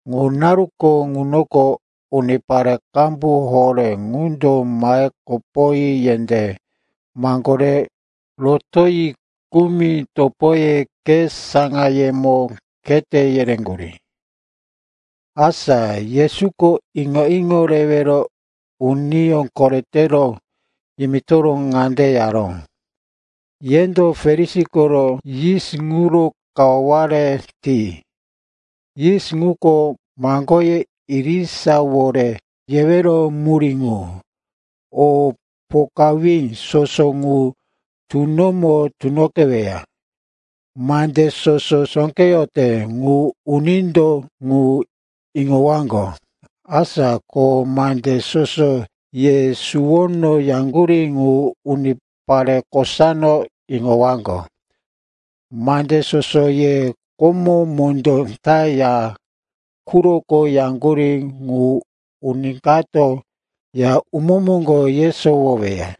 Ŋu naru ŋunoko unipare qambu horé qundo mahe kopoyi yendé maŋgore rotoyi, kumi topoye khe saŋayemo khete yereyaŋgurí. Asa Yesuko iŋo-iŋo rewero uniyó koretero yimitoro ŋande yaró, “Yendo Farisi koro yis ŋuro kawaware ti. Yis ŋuko maŋgoye irisawore yewero murí ŋu. O pokawí soso ŋu tunomo tunoqeweya. Mande soso sóqeyote ŋu unindo ŋu iŋowaŋgo. Asa ko mande soso ye suwono yaŋgurí ŋu unipare kosano iŋowaŋgo. Mande soso ye komo mondó ta ya quroko yaŋgurí ŋu uni kato ya umó moŋgo yesowoweya.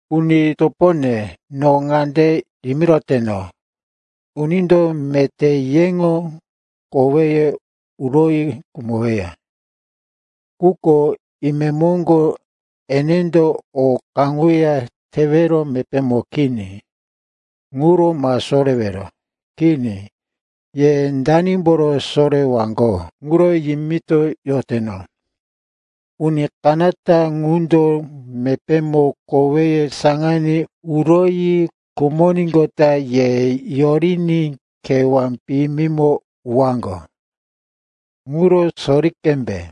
“Uni topone, no ŋande yimiroteno, unindo meté yeŋo koweye uroyi khumoweya, quko imemoŋgo enendo o kaŋuya tewero mepémo kini. Ŋuro ma sorewero. Kini, ye danimboro sorewaŋgo ŋuro yimitoyoteno. Uni kanata ŋundo mepémo koweye saŋaní uroyi khumoníqota ye yoriní kewá piyimimo uwaŋgo. Ŋuro sori qembe.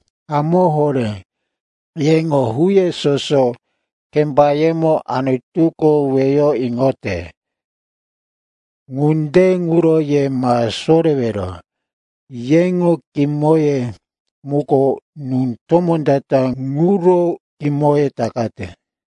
Hamó horé, yeŋo huye soso kembayemo Anutuko weyo iŋote. Ŋunde ŋuro ye ma sorewero. Yeŋo kimoye ŋuko nú tomó ta-ta ŋuro kimoye takate.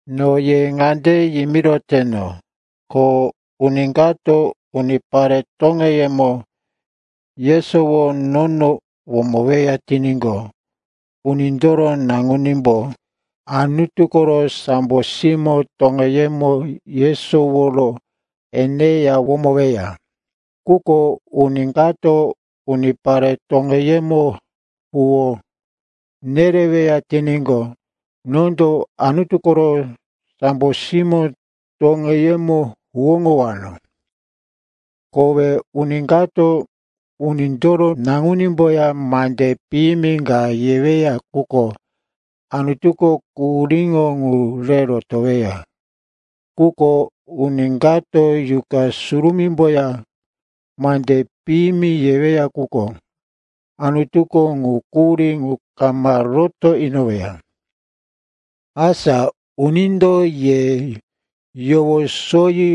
“No ye ŋande yimiroteno, ko uni kato unipare toŋeyemo yesoworo nono womoweya tiníqo, Unindoro Naŋunímbo Anutu koro sambo simó toŋeyemo yesoworo eneya womoweya. Quko uni kato unipare toŋeyemo huwó nereweya tiníqo, nondo Anutu koro sambo simó toŋeyemo huwóŋowano. Kowe uni kato Unindoro Naŋunímboya mande piyimi ka yeweya quko, Anutuko quhuríŋo ŋu re rotoweya. Quko uni kato Yuqa Surumímboya mande piyimi yeweya quko, Anutuko ŋu quhurí ŋu kama roto inoweya. “Asa unindo ye yowosoyi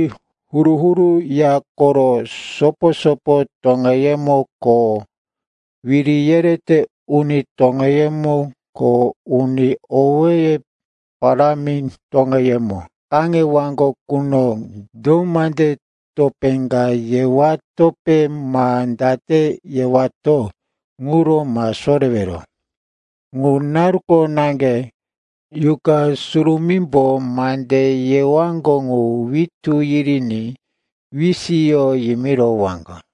huru-huru ya koro sopo-sopo toŋeyemo ko wiri yerete uni toŋeyemo ko uni owéye parámi toŋeyemo kaŋewaŋgo quno, do mande topé ka yewatope ma date yewato ŋuro ma sorewero. Ŋu naruko naŋge Yuqa Surumímbo mande yewaŋgo ŋu witú yiriní wisiyo yimirowaŋgo.”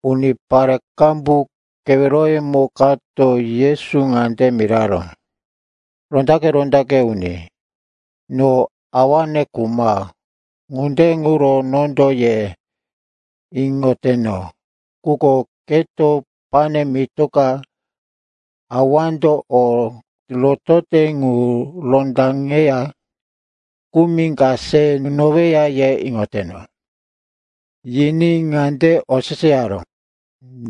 Unipare qambu keweroyemo kato Yesu ŋande miraró, “Rondaqe-rondaqe uni, no awane khuma, ŋunde ŋuro nondo ye iŋoteno quko keto pane mitoka awando o rotote ŋu rondaŋeya kumi ka se nunoweya, ye iŋoteno.” Yiní ŋande oseseyaró,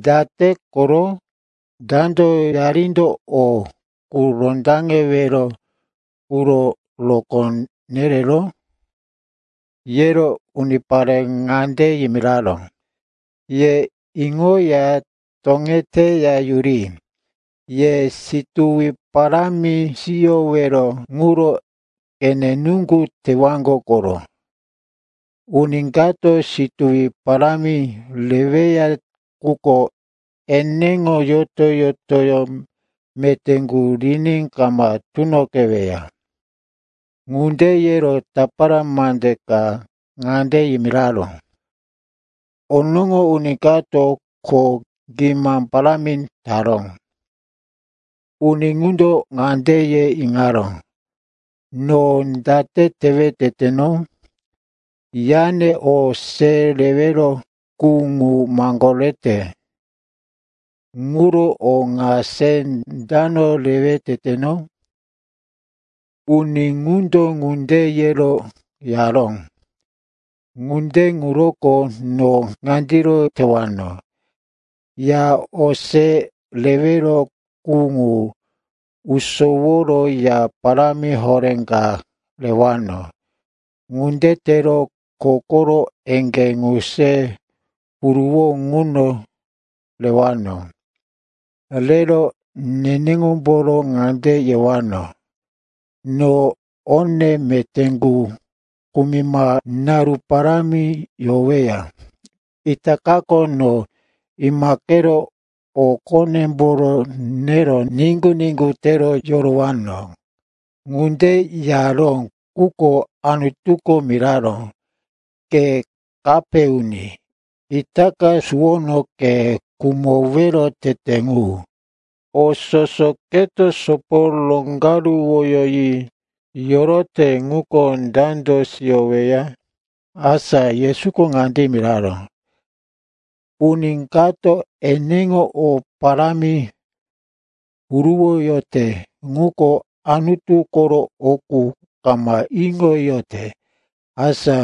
“Date koro? Dando yarindo o qu rondaŋewero quro rokó nereró?” Yero unipare ŋande yimiraró, “Ye iŋoya toŋeteya yuri. Ye situwi parámi siyowero ŋuro qene nuŋgu tewaŋgo koro. Uni kato situwi parámi reweya ŋuko eneŋo yoto-yotoyó meté ŋu riní kama tunoqeweya.” Ŋunde yero tapara mande ka ŋande yimiraró, “Onoŋo uni kato kho gima parámi taró. Uni ŋundo ŋande ye iŋaró, ‘No date tewe teteno? Yane o se rewero qu ŋu maŋgorete. Ŋuro o ŋa se dano rewe teteno?’ “Uni ŋundo ŋunde yero yaró, ‘Ŋunde ŋuroko no ŋandiro tewano. Ya o se rewero qu ŋu usoworo ya parámi horé ka rewano. Ŋunde tero kho koro eŋgé ŋu se huruwo ŋuno rewano. Rero neneŋomboro ŋande yewano, “No one meté qu kumima naru parámi yoweya. Itakako no imaqero o qonemboro nero niŋgu-niŋgu tero yorowano.”’ “Ŋunde yaró, quko Anutuko miraró, ‘Ke kape uni. Itaka suwono ke khumowero tete ŋu! O soso keto sopo roŋgaruwoyi yorote ŋuko dando siyoweya?’” Asa Yesuko ŋande yimiraró, “Uni kato eneŋo o parámi huruwoyote, quko Anutu koro o qu kama iŋoyote, asa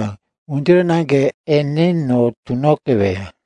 ŋundiro naŋge eneno tunoqeweya.”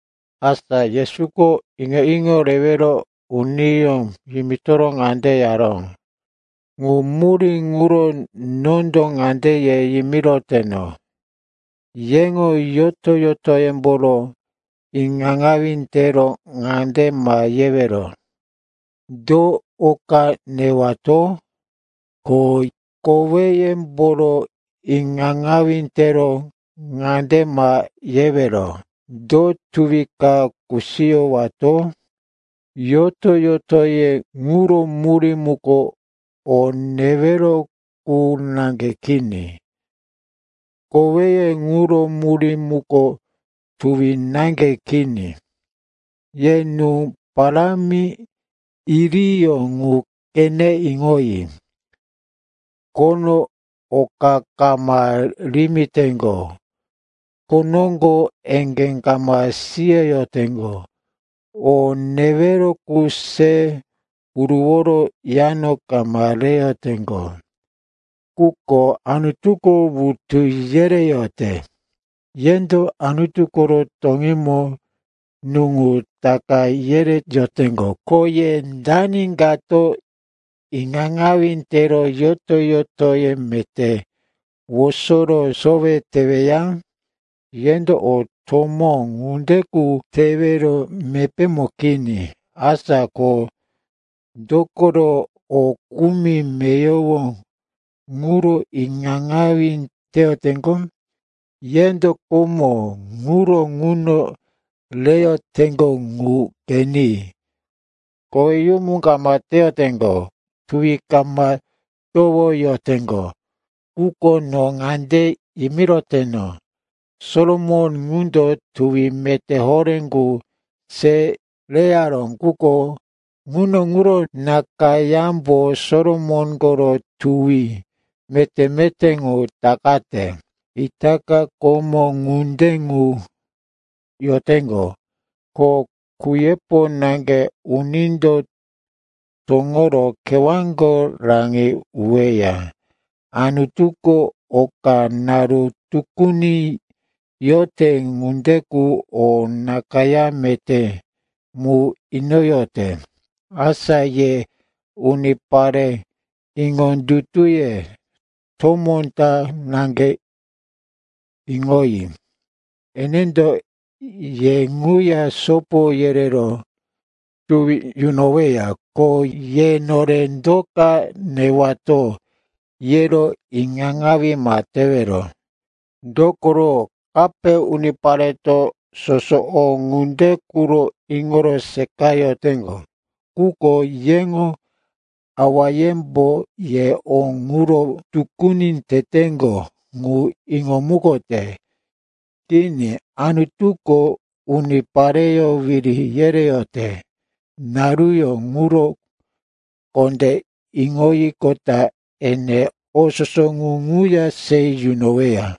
Asa Yesuko iŋo-iŋo rewero uniyó yimito ŋande yaró, “Ŋu murí ŋuro nondo ŋande ye yimiroteno, yeŋo yoto-yotoyemboro iŋaŋawí tero ŋande ma yewero, ‘Do o ka newato?’ Ko koweyemboro iŋaŋawí tero ŋande ma yewero, ‘Do tuwi ka kusiyowato?’ Yoto-yotoye ŋuro murí muko o newero qu naŋge kini. Koweye ŋuro murí muko tuwi naŋge kini. Ye nú parámi iriyó ŋu qeneya iŋoyi. Khono oka kama rimiteŋgo, kho noŋgo eŋgé kama siyoyoteŋgo, o newero qu se huruworo yano kama reyoteŋgo. Quko Anutuko wutu yereyote. Yendo Anutu koro toŋímo nú ŋu taka yereyoteŋgo. Ko ye dani kato iŋaŋawí tero yoto-yotoyó meté wosoro sowe teweya? Yendo o tomó ŋunde qu tewero mepémo kini. Asa ko dokoro o kumi meyowo quro iŋaŋawí teyoteŋgo? “Yendo komó ŋuro nuŋo reyoteŋgo ŋu qeni. Koweyumu kama teyoteŋgo, tuwi kama towoyoteŋgo. Quko no ŋande yimiroteno, Solomon ŋundo tuwi meté horé qu se reyaró, quko nuŋo ŋuro nakayámbo Solomon koro tuwi meté-meté ŋu takate. Itaka komó ŋunde qu yoteŋgo, ko kuyepo naŋge unindo toŋoro kewáko raŋi uweya. Anutuko oka naru tukuni yorote ŋunde qu o nakayá meté mu inoyote. Asa ye unipare iŋondutuye tomó ta naŋge, iŋoyi, enendo ye ŋuya sopo yerero tuwi yunoweya. Ko ye, nore do ka newato, yero iŋaŋawí ma tewero. Dokoro kape unipareto soso o ŋunde quro iŋoro seqayoteŋgo. Quko yeŋo awayembo ye o ŋuro tukuni teteŋgo ŋu iŋomukote. Kini, Anutuko unipareyó wiri yereyote naruyó ŋuro kondé iŋoyiqota ene o soso ŋu ŋuya se yunoweya.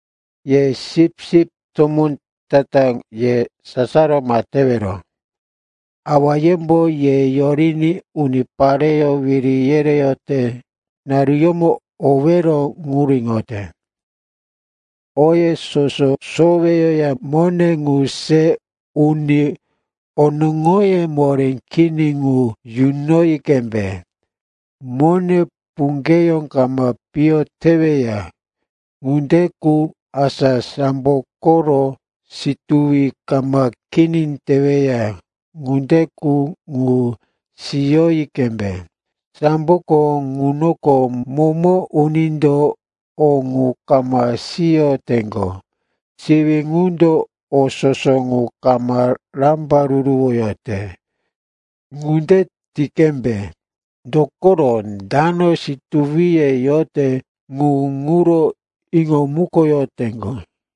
“Ye sipsip tomó ta-ta, ye sasaro ma tewero. Awayembo ye yoriní unipareyó wiri yereyote naruyómo owero ŋuro iŋote. Oye soso soweyoya mone ŋu se uni onoŋoye moré kini ŋu yunoyi qembe. Mone puŋgeyó kama piyo teweya ŋunde qu, asa sambo koro situwi kama kini teweya ŋunde qu, ŋu siyoyi qembe. Samboko ŋunoko momo unindo o ŋu kama siyoteŋgo, siwí ŋundo o soso ŋu kama rambaruruwote. Ŋunde ti qembe, dokoro dano situwiye yote, ŋu ŋuro iŋomukoyoteŋgo.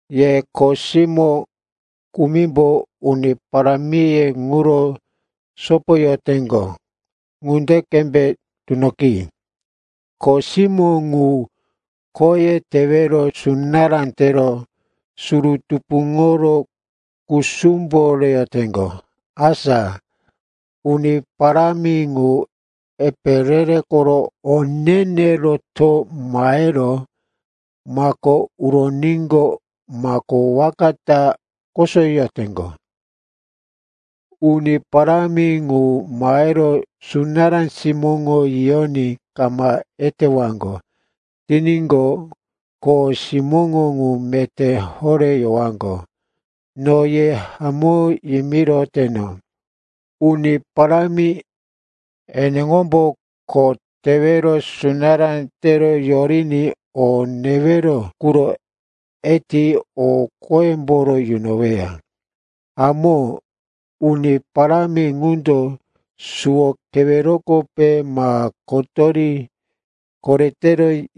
“Ye kho simó kumimbo uni parámiye ŋuro sopoyoteŋgo ŋunde qembe tunoqi. Kho simó ŋu khoye tewero sunará tero, suru tupuŋoro kusumbo reyoteŋgo. Asa uni parámi ŋu epe re-re koro o ne-ne roto mahero mako uroníqo, mako waka ta kosoyoteŋgo. Uni parámi ŋu mahero sunará simóŋo yiyoní kama etewaŋgo tiníqo, kho simóŋo ŋu meté horé yowaŋgo. No ye hamó yimiroteno, uni parámi eneŋombo kho tewero sunará tero yoriní o newero quro eti o qoyemboro yunoweya. Hamó, uni parámi ŋundo suwo kewerokope ma kotori korete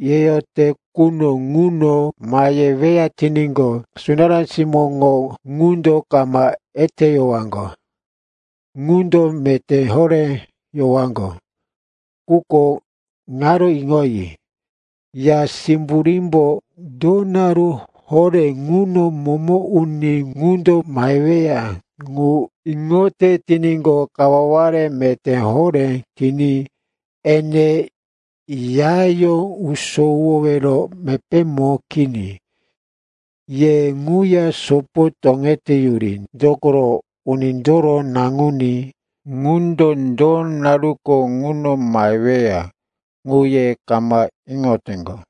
yeyote quno ŋuno maheweya tiníqo, sunará simóŋo ŋundo kama eteyowaŋgo qundo meté horé yowaŋgo. Quko ŋaro iŋoyi, ya simburímbo do naru horé ŋuno momo uni ŋundo maheweya ŋu iŋote tiníqo, kawaware meté horé tiní ene yayó usowowero mepémo kini. Ye ŋuya sopo toŋeteyuri. Dokoro Unindoro Naŋuní ŋundo do naruko ŋuno maheweya, ŋu ye kama iŋoteŋgo.”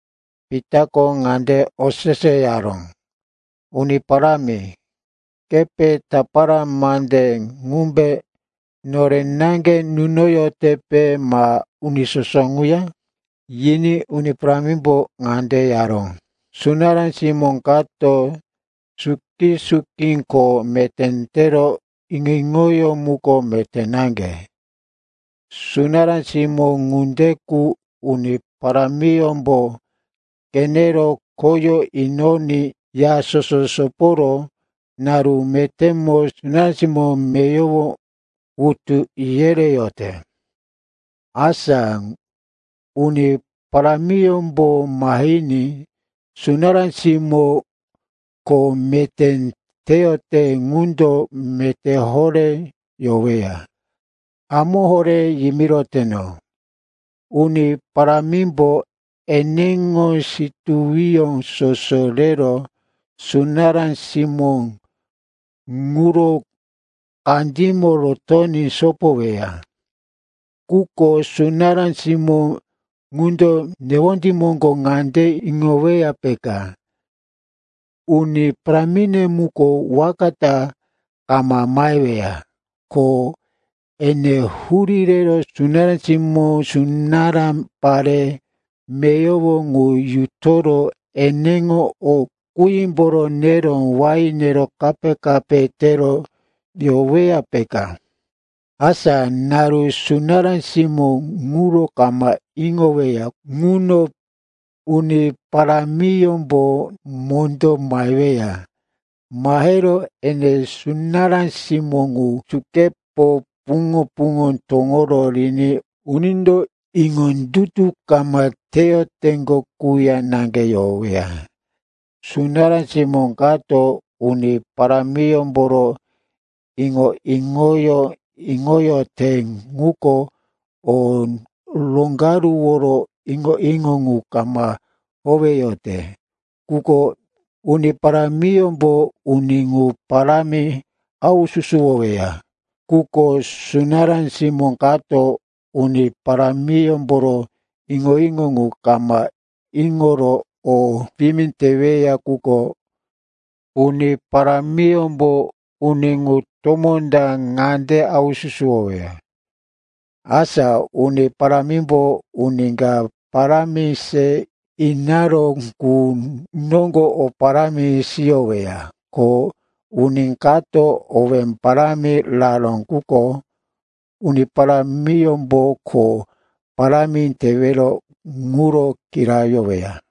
Pitako ŋande oseseyaró, “Uni Parámi, kepe tapara mande ŋumbe nore naŋge nunoyotepe ma uni soso ŋuya?” Yiní Uni Parámimbo ŋande yaró, “Sunará simó kato suki-suki kho meté tero iŋo-iŋoyó muko meté naŋge. Sunará simó ŋunde qu uni parámiyómbo qenero khoyó inoní ya soso soporo naru metémo sunará simó meyowo wutu yereyote. Asa uni parámiyómbo mahiní sunará simó kho meté teyote ŋundo meté horé yoweya. Hamó horé yimiroteno, uni parámimbo eneŋo situwiyó soso rero sunará simó ŋuro kandímo rotoní sopoweya. Quko sunará simó ŋundo newondí moŋgo ŋande iŋoweya, peka, uni parámine muko waka ta kama maheweya. Ko ene hurí rero sunará simó, sunará pare meyowo ŋu yutoro eneŋo o qímboro nero wain nero kape-kape tero yoweya, peka. Asa naru sunará simó ŋuro kama iŋoweya quno, uni parámiyómbo mondó maheweya. Mahero ene sunará simó ŋu sukepo puŋo-puŋo toŋoro riní unindo iŋondutu kama teyoteŋgo quya naŋge yoweya. “Sunará simó kato uni parámiyómboro iŋo-iŋoyó iŋoyote, quko o roŋgaruworo iŋo-iŋo ŋu kama howeyote ŋuko, uni parámiyómbo uni ŋu parámi haususuwoweya. Quko sunará simó kato uni parámiyómboro iŋo-iŋo ŋu kama iŋoro o piyimi teweya ŋuko, uni parámiyómbo uni ŋu tomó ta naŋge haususuwoweya. Asa uni parámimbo uni ka parámi se inaró qu noŋgo o parámi siyoweya. Ko uni kato owé parámi raró ŋuko, uni parámiyómbo kho parámi tewero ŋuro kirayoweya.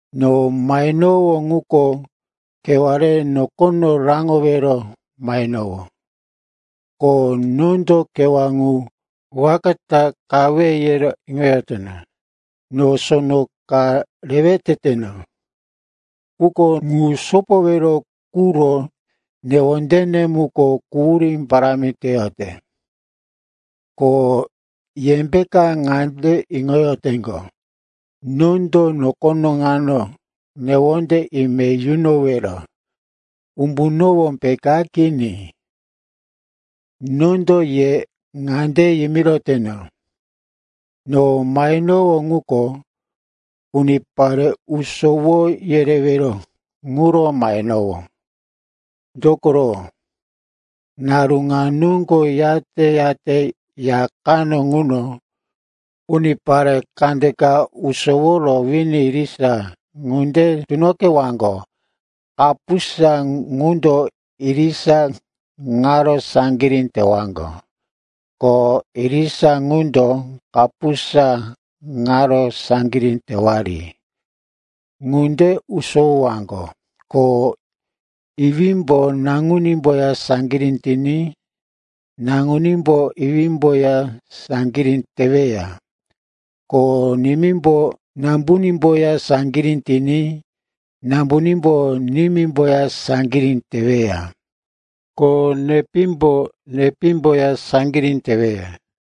“No mahenowó ŋuko kewá re nokono raŋowero mahenowó, ko nondo kewá ŋu waka ta qawe, yero iŋoyoteno. No sono ka rewe teteno, quko ŋu sopowero quro newondene muko quhurí parámi teyote. Ko yembeka ŋande iŋoyoteŋgo, nondo nokono ŋano newonde ime yunowero umbunowó, peka? Kini. Nondo ye ŋande yimiroteno, no mahenowó ŋuko unipare usowo yerewero quro mahenowó. Dokoro naru ŋa noŋgo yate-yate ya kano ŋuno unipare kandeka usoworo wini irisa ŋunde tunoqewaŋgo. Kapusa ŋundo irisa ŋaro saŋgirí tewaŋgo, ko irisa ŋundo kapusa ŋaro saŋgirí tewari. “Ŋunde usowowaŋgo, ko iwímbo naŋunímboya saŋgirí tiní naŋunímbo iwímboya saŋgirí teweya. Ko nimímbo nambunímboya saŋgirí tiní nambunímbo nimímboya saŋgirí teweya. Ko nepímbo nepímboya saŋgirí teweya.”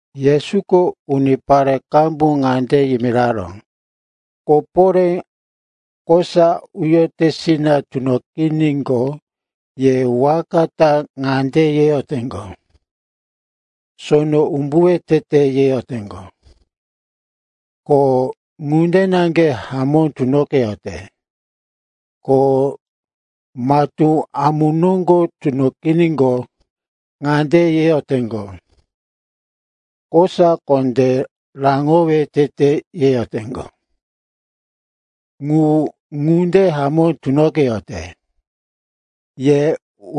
Yesuko unipare qambu ŋande yimiraró, “Koporé kosa uyotesina tunoqiníqo, ye waka ta ŋande yeyoteŋgo, sono umbuwe tete, yeyoteŋgo. Ko ŋunde na hamó tunoqeyote. Ko matú amu noŋgo tunoqiníqo, ŋande yeyoteŋgo, kosa kondé raŋowero tete, yeyoteŋgo. Ŋu ŋunde hamó tunoqeyote. Ye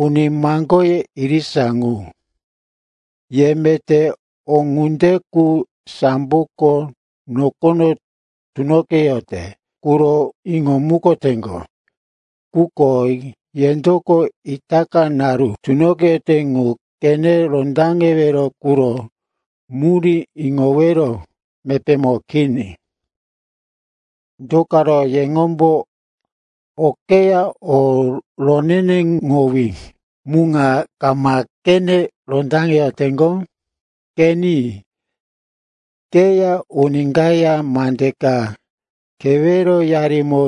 uni maŋgoye irisa qu, ye meté o ŋunde qu samboko nokono tunoqeyote ŋuro iŋomukoteŋgo, quko yendoko itaka naru tunoqeyote ŋuro qene rondaŋewero quro murí iŋowero mepémo kini. “Do karo yeŋombo okeyá o roneneŋowí mu ŋa kama qene rondaŋeyoteŋgo? Qeni, keya uni kaya mande ka keweroyarimo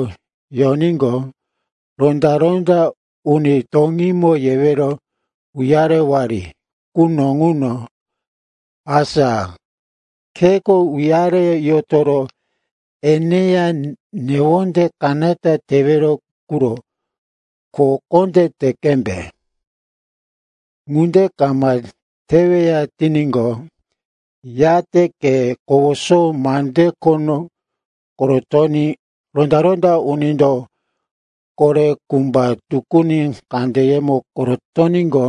yoníqo, ronda-ronda uni toŋímo yewero uyarewari quno ŋuno, asa kheko uyare yotoro eneya newonde kanata tewero quro kho kondé te qembe. Ŋunde kama teweya tiníqo, yate ke kowoso mande khono korotoní ronda-ronda unindo kore kumba tukuni kandeyemo korotoníqo,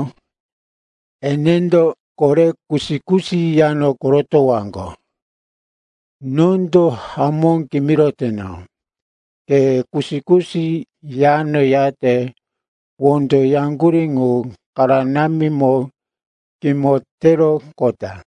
enendo kore kusi-kusi yano korotowaŋgo. Nondo hamó kimiroteno, ke kusi-kusi yano yate wondo yaŋgurí ŋu kanaramimo kimo teroqota.”